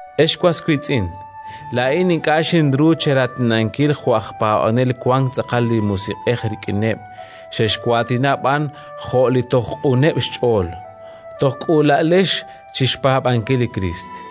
Ex was wiitz'in, laa'in ink'a' xinru cheraatinankil jo' aj paab'anel wank tz'aqal li Musiq'ej rik'ineb', xexwaatina b'an jo' li toj q'uneb' xch'ool, toj k'uula'alex chi xpaab'ankil li Kriist.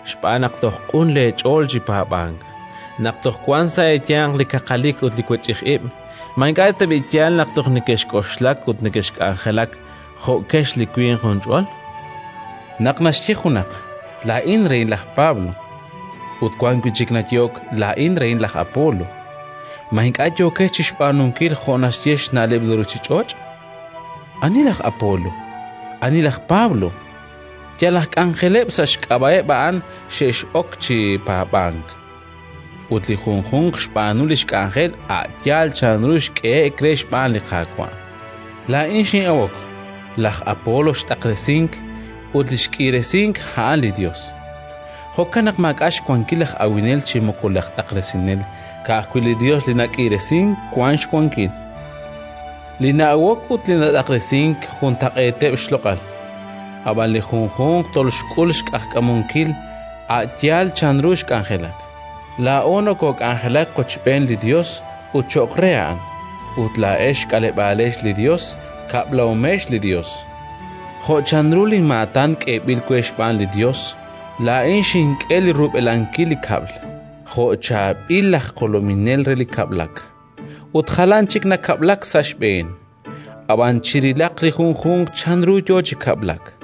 xb'aan naq toj q'un leech'ool chi paab'ank. Naq toj wanq sa' eeyanq li kaqalik ut li wech'ij ib', ma ink'a' tab'i' yaal naq toj nekexk'oxlak ut nekexk'anjelak jo'kex li winq junch'ol? Naq naxye junaq: “Laa'in rehin laj Pablo”, ut wan wi' chik nayehok: “Laa'in rehin laj Apolo”, ma ink'a' yookex chi xb'aanunkil jo' naxye xna'leb' li ruuchich'och'? Ani laj Apolo? Ani laj Pablo? Yal aj k'anjeleb'. Sa' xk'ab'a'eb' a'an xex'ok chi paab'ank, ut li junjunq xb'aanu li xk'anjel a' yaal chanru xk'ehe'k re xb'aan li Qaawa'. Laa'in xin'awok, laj Apolo xt'aqresink; ut li xk'iiresink, a'an li Yos. Jo'kan naq maak'a' xwankil laj awinel chi moko laj t'aqresinel; ka'ajwi' li Yos li nak'iiresink wank xwankil. Li na'awok ut li nat'aqresink juntaq'eeteb' xloq'al, ab'an li junjunq toxk'ul xq'ajkamunkil a' yaal chanru xk'anjelak. Laa'o nokook'anjelak qochb'een li Yos ut cho'q re A'an; ut laa'ex xk'aleb'aalex li Yos, xkab'lahomex li Yos. Jo' chanru linmaatan k'eeb'il we xb'aan li Yos, laa'in xink'e li rub'elankil li kab'l, jo' chaab'il aj jolominel re li kab'lak, ut jalan chik nakab'lak sa' xb'een. Ab'an chirilaq li junjunq chanru yo chi kab'lak,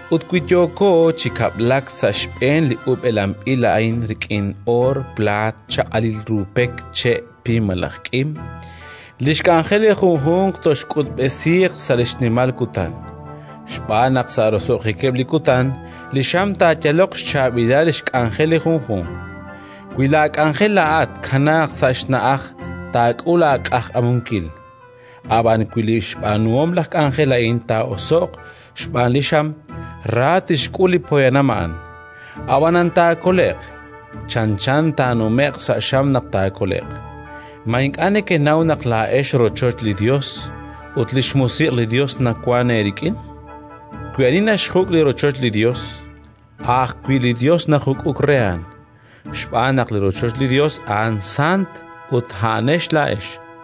Ut wi yooko chi kab'lak sa' xb'een li ub'elanb'il a'in rik'in oor, plaat, chaq'alil ru pek, che', pim malaj k'im, li xk'anjel li junjunq toxk'utb'esiiq sa' li xnimal kutan. Xb'aan naq sa' roso'jikeb' li kutan li xam taayaloq xchaab'ilal xk'anjel li junjunq. Wi laak'anjel laa'at tkanaaq sa' xna'aj, taak'ul aaq'ajkamunkil; ab'an wi li xb'aanuhom laj k'anjel a'an taa'oso'q xb'aan li xam, ra tixk'ul li poyanam a'an. Ab'anan taakole'q: chanchan taanume'q sa' xam naq taakole'q. Ma ink'a' nekenaw naq laa'ex rochoch li Yos ut li xMusiq' li Yos nawank eerik'in? Wi ani naxjuk' li rochoch li Yos, a' ajwi' li Yos taajuk'uq re a'an, xb'aan naq li rochoch li Yos a'an sant ut a'anex laa'ex.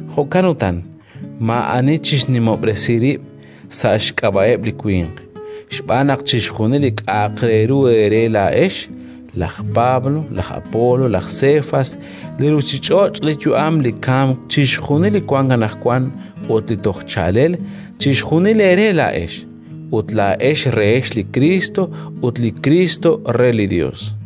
Jo'kan utan, maa'ani chixnimob'resi rib' sa' xk'ab'a'eb' li winq, xb'aan naq chixjunil li k'a'aq re ru eere laa'ex: laj Pablo, laj Apolo, laj Sefas, li ruuchich'och', li yu'am, li kamk, chixjunil li wank anaqwan ut li toj chaalel, chixjunil eere laa'ex; ut laa'ex rehex li Kriist, ut li Kriist re li Yos.